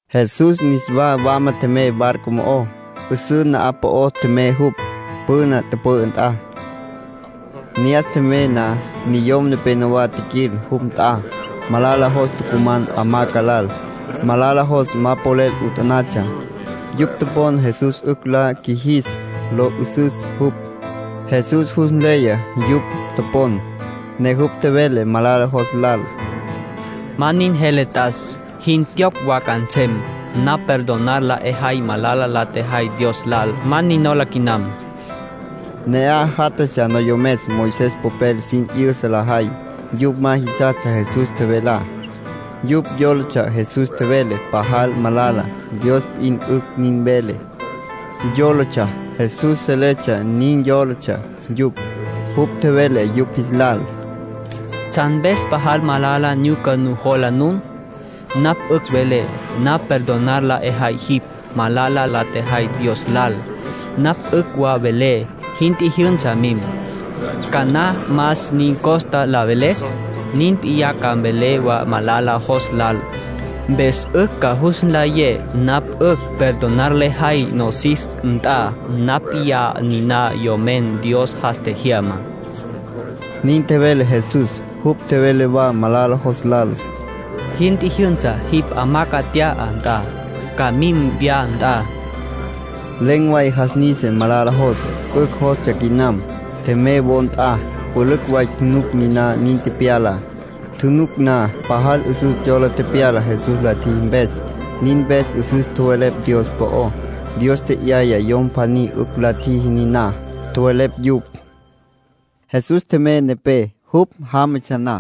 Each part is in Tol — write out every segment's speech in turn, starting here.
Jesús niswa wama tjemey barco mo'ó. 'Üsǘ na'aj po'o tjemey jupj, püna tüpü'ü nt'a. Ne'as tjemey na, niyom nepenowá tjiquil jupj nt'a. Malala jos tucuman hamaca lal. Malala jos ma polel 'utanatsja. Yupj topon Jesús 'ücj la qjuijis lo 'ü'süs jupj. Jesús jus nleya yupj topon, ne jupj tjevele malala jos lal: —Ma nin jele t'as. Jin tjiyocj wa ca nsem. Napj perdonar la 'ejay malala la tjejay Dios lal. Ma nin nola quinam. Ne'aj játjatsja noyomes Moisés popel sin 'yüsa lajay. Yupj ma jisastsja Jesús tjevelá. Yupj yólatsja Jesús tjevele pajal malala. Dios p'in 'ücj nin vele, yólatsja. Jesús seletsja nin yólatsja yupj. Jupj tjevele yupj jis lal: —¿Tsjan mpes pajal malala nyuca nujola nun? Napj 'ücj velé: ‘Napj perdonar la 'ejay jipj malala la tjejay Dios lal’. Napj 'ücj wa velé: ‘Jin tjijyünsa, mim’. ¿Cana más 'in costa la veles? Nin p'iyá ca mvelé wa malala jos lal, mpes nun ca jus nlayé napj 'ücj perdonar lejay nosis nt'a. Napj p'iyá niná Yomen Dios jas tjejyamá —nin tjevele Jesús. Jupj tjevele wa malala jos lal: —Jin tjijyünsa. Jipj hamaca nt'ya, nt'an. Ca mim wya nt'a. Len̈ way jas nisa malala jos. 'Ücj jostsja quinam. Tjemey wo nt'a. Pülücj way tjunuc niná nin tepyalá. Tjunuc na pajal 'üsüs yola tepyala Jesús la tjiji mpes. Nin mpes 'üsüs tjowelepj Dios po'ó. Dios tje'yaya yom pjaní 'ücj la tjiji niná, tjowelepj yupj. Jesús tjemey nepé. Jupj jámatsja na,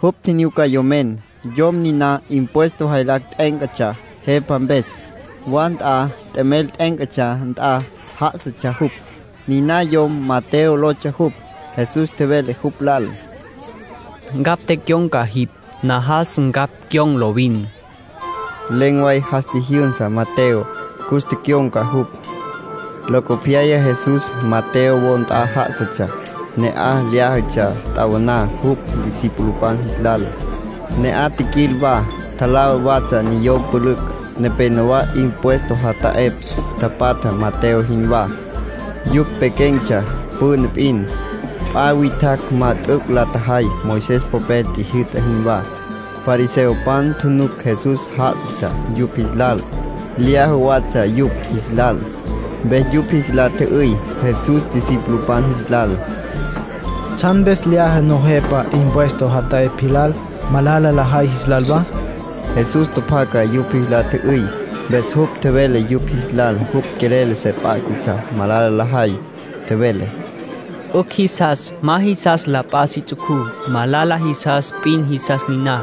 jupj tjinyuca yomen. Yom niná impuesto jaylacj t'e'éncatsja jepa mpes. Wa nt'a t'emel t'e'éncatsja nt'a já'asatsja jupj. Niná yom Mateo lotsja jupj. Jesús tjevele jupj lal: “Ncapj tecyon̈ca jipj. Najas ncapj cyon̈ lovin.” Len̈ way jas tjijyünsa Mateo, cus tecyon̈ca jupj. Locopyaya Jesús Mateo wo nt'a já'asatsja. Ne'aj lyájatsja t'awaná jupj discipulopan jis lal. Ne'aj tjiquil wa, tjalá watsja niyom pülücj. Nepénowa impuesto jata'epj tapatja Mateo jinwá. Yupj pequen̈tsja püna p'in. P'a witjacj ma t'üc' la tjajay Moisés popel tjijyü'ta jinwá. Fariseopan tjunuc Jesús já'asatsja yupj jis lal, lyaja watsja yupj jis lal. Mpes yupj jis la tjü'üy Jesús discipulopan jis lal: —¿Tsjan mpes lyaja nujepa impuesto jata'epj jis lal, malala lajay jis lal wa? Jesús tjapjaca yupj jis la tjü'üy. Mpes jupj tjevele yupj jis lal jupj quelel se p'á'satsja malala lajay. Tjevele: —'Ücj jisas ma jisas la p'a si ts'ucú. Malala jisas p'in jisas niná.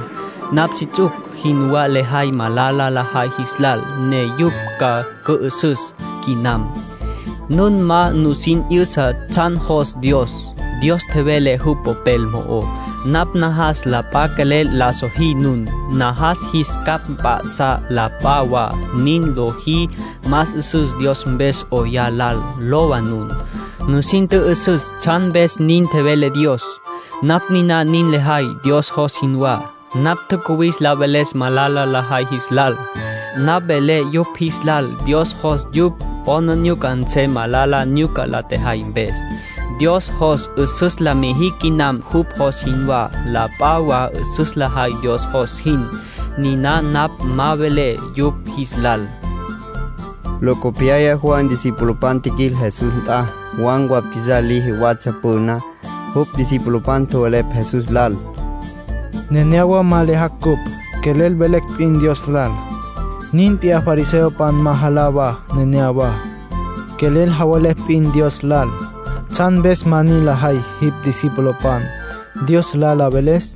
Napj si ts'uc jinwá lejay malala lajay jis lal, ne yupj ca cü'ü'süs quinam. Nun ma nusin 'yüsa tsjan jos Dios. Dios tjevele jupj Popel mo'ó: ‘Napj najas la p'a quelel la sojí nun. Najas jis capj mp'a'sá la p'a wa. Niná lojí más 'üsüs Dios mpes 'oyá lal.’ Lowa nun, nusin tjü'üsüs tsjan mpes nin tjevele Dios. Napj niná nin lejay Dios jos jinwá. Napj tjacuwis la veles malala lajay jis lal. Napj velé yupj jis lal Dios jos yupj 'aplijila nsem malala nyuca la tjajay mpes. Dios jos 'üsüs la mijicj quinam jupj jos jinwá. La p'a wa 'üsüs lajay Dios jos jin. Niná napj ma velé yupj jis lal —nin tjevele Jesús. Locopyaya Juan discipulopan tjiquil Jesús nt'a. Juan bautizar liji watsja püná. Jupj discipulopan tjowelepj Jesús lal: —Nenéyawa ma lyajacj cupj, quelel velecj p'in Dios lal. Nin p'iyá fariseopan ma jalá wa neneyawá, quelel javelepj p'in Dios lal. ¿Tsjan mpes ma nin lajay jipj discipulopan, Dios lal la veles?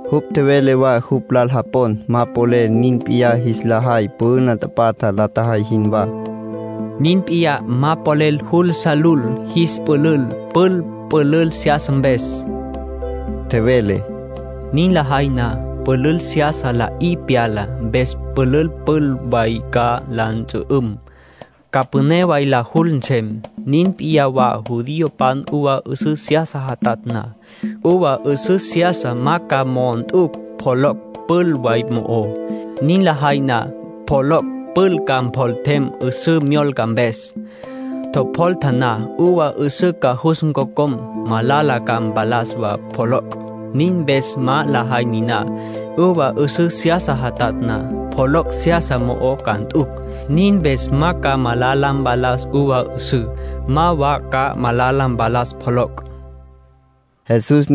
Jupj tjevele wa jupj lal japon ma polel nin p'iyá jis la jay püna tapatja la tjajay jinwá. —Nin p'iyá ma polel jul sa lul jis pülül pül pülül seyasa mpes —tjevele—. Nin lajay na, pülül seyasa la'í pyala. Mpes pülül pül way ca la ntsü'üm, ca püné way la jul nsem. Nin p'iyá wa, judiopan uva 'üsǘ seyasa jatatj na. Uva 'üsǘ seyasa ma ca mo'o nt'ucj pjoloc' pül way mo'ó. Nin lajay niná, pjoloc' pül ca mpjoltem 'üsǘ myolca mpes. Tjopjolta na, uva 'üsǘ ca jus ncocom. Malala ca mpalas wa pjoloc'. Nin mpes ma lajay niná. Uva 'üsǘ seyasa jatatj na, pjoloc' seyasa mo'o ca nt'ucj. Nin mpes ma ca malala mpalas uva 'üsǘ, ma wa ca malala mpalas pjoloc' —nin tjevele Jesús.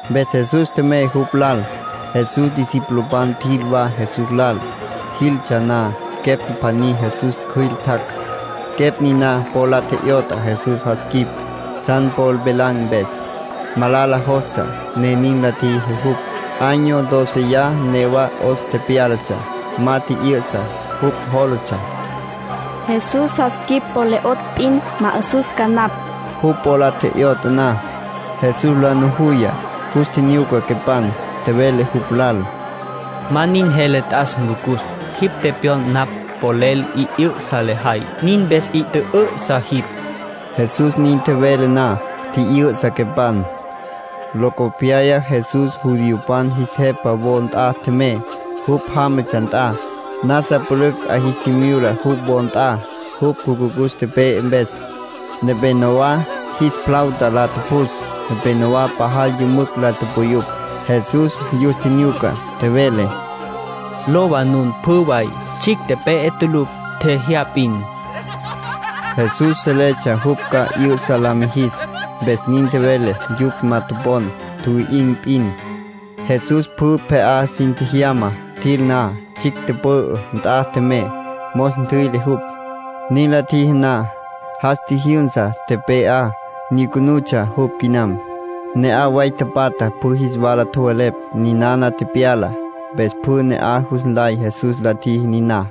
Mpes Jesús tjemey jupj lal. Jesús discipulopan tjil wa Jesús lal. Jiltsja na, quepj pjaní Jesús cjüil tjac'. Quepj niná po la tje'yot'a Jesús jas quip, tsjan po velan̈ mpes. Malala jostsja, ne nin la tjiji jupj. Año dóceya newa 'os tepyálatsja, ma tji'yü'sa. Jupj jólatsja: “Jesús jas quip po le 'otj p'in, ma 'ü'süs ca napj”. Jupj po la tje'yot'a na, Jesús la nujuya, jus tjinyuca quepan. Tjevele jupj lal: —Ma nin jele t'as, Ncucus. Jipj tepyon napj polel 'i 'ü'sa lejay, nin mpes 'i tjü'ü'sa jipj. Jesús nin tjevele na, tji'yü'sa quepan. Locopyaya Jesús judiopan jis jepa wo nt'a tjemey, jupj jámatsja nt'a. Nasa pülücj 'a jis tjimyula jupj wo nt'a, jupj jucucus tepe'e mpes. Nepénowa jis flauta la tjupjus. Nepénowa pajal yümücj la tupuyupj. Jesús yus tjinyuca, tjevele: —Lowa, nun pjü way. Tsjicj tepe'e tulucj. Tjejyá p'in. Jesús seletsja jupj ca 'yü'sa la mijis, mpes nin tjevele. Yupj ma topon. Tjuwi'in̈ p'in. Jesús pjü pje'á sin tjejyama. Tjil na, tsjicj tüpü'ü nt'a tjemey, mos ntjüi'le jupj. Nin la tjiji na, jas tjijyünsa tepe'á. Nyucunutsja jupj quinam. Ne'aj way tapatjá pjü jis wala tjowelepj ninana tepyalá. Mpes pjü ne'aj jus nlay Jesús la tjiji niná.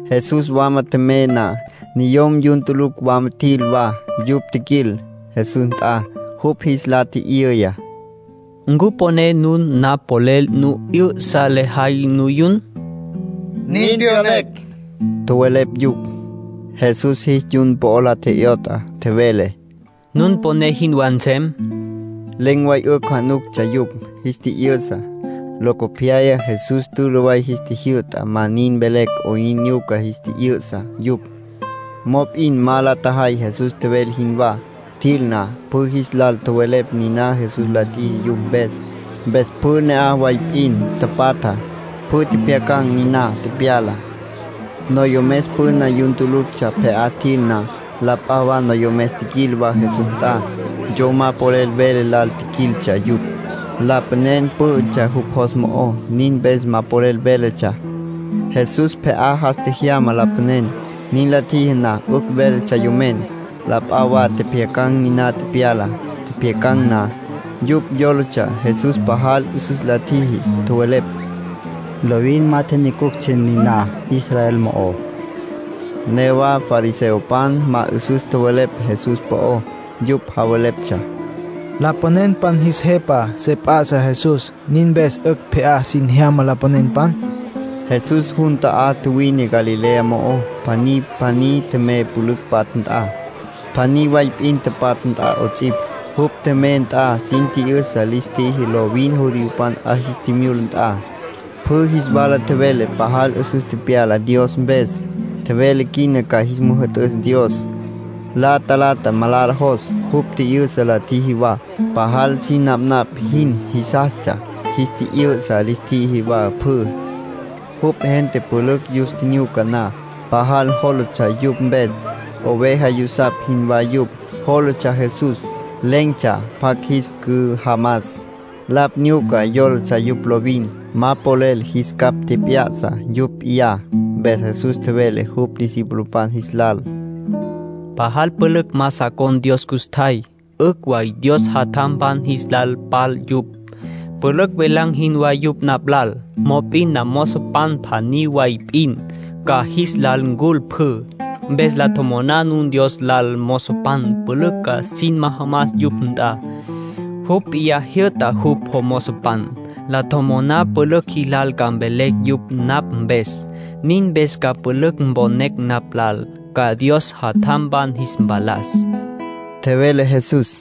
Jesús wama tjemey na, niyom yun tulucj wama tjil wa. Yupj tjiquil Jesús nt'a. Jupj jis la tji'yüya: —¿Ncu poné nun napj polel nu 'yü'sa lejay nuyun? —Nin pyonecj —tjowelepj yupj. Jesús jis yun po la tje'yot'a. Tjevele: —Nun poné jinwá nsem. Len̈ way 'ücj januctsja yupj, jis tji'yü'sa. Locopyaya Jesús tülü way jis tjijyü'ta ma nin mvelecj 'oyn nyuca jis tji'yü'sa yupj. Mop'in ma la tjajay Jesús tjevele jinwá. Tjil na, pjü jis lal tjowelepj niná Jesús la tjiji yupj mpes. Mpes pjü ne'aj way p'in tapatja, pjü tjepjyacan̈ niná tepyalá. Noyomes püna yun tuluctsja pje'á tjil na, la p'a wa noyomes tjiquil wa Jesús nt'a. Yom ma polel vele lal tjiquiltsja yupj. Lapanen pǘ'ütsja jupj jos mo'ó. Nin mpes ma polel véletsja. Jesús pje'á jas tjejyama lapanen. Nin la tjiji na, 'ücj véletsja yomen. La p'a wa tjepjyacan̈ niná tepyalá. Tjepjyacan̈ na, yupj yólatsja Jesús pajal 'üsüs la tjiji. Tjowelepj: “Lovin ma tjinyucuctsja niná Israel mo'ó”. Newa fariseopan ma 'üsüs tjowelepj Jesús po'ó. Yupj javeleptsja: “Lapanenpan jis jepa se p'a'sa Jesús. Nin mpes 'ücj pje'á sin jyama lapanenpan.” Jesús jun ta'á tjuwine Galilea mo'ó. Pjaní pjaní tjemey pülücj patja nt'a, pjaní way p'in patja nt'a 'ots'ipj. Jupj tjemey nt'a sin tji'yüsa lis tjiji lovin judiopan 'a jis tjimyula nt'a. Pjü jis wala tjevele pajal 'üsüs tepyala Dios mpes. Tjevele quina ca jis müjü'tüs Dios. La talata malala jos, jupj tji'yü'sa la tjiji wa. Pajal sin napnapj jin jisastsja jis tji'yü'sa lis tjiji wa pjü. Jupj gente pülücj yus tjinyuca na, pajal jólatsja yupj mpes. Oveja yusapj jinwá yupj, jólatsja Jesús. Len̈tsja pjacj jis cüjamas. Lapj nyuca yólatsja yupj lovin. Ma polel jis capj tjep'ya'sa yupj p'iyá. Mpes Jesús tjevele jupj discipulopan jis lal: “Pajal pülücj ma sa con̈ Dios custjay. 'Ücj wa Dios jatjampan jis la pal yupj. Pülücj velan̈ jinwá yupj napj lal. Mop'in namozopan pjaní way p'in, ca jis lal ncul pjü. Mpes la tjomoná nun Dios lal mozopan pülücj ca sin majamas yupj nt'a. Jupj p'iyá jyü'ta jupj mozopan. La tjomoná pülücj jilal ca mvelecj yupj napj mpes. Nin mpes ca pülücj mponecj napj lal, ca Dios jatjampan jis mpalas”, tjevele Jesús.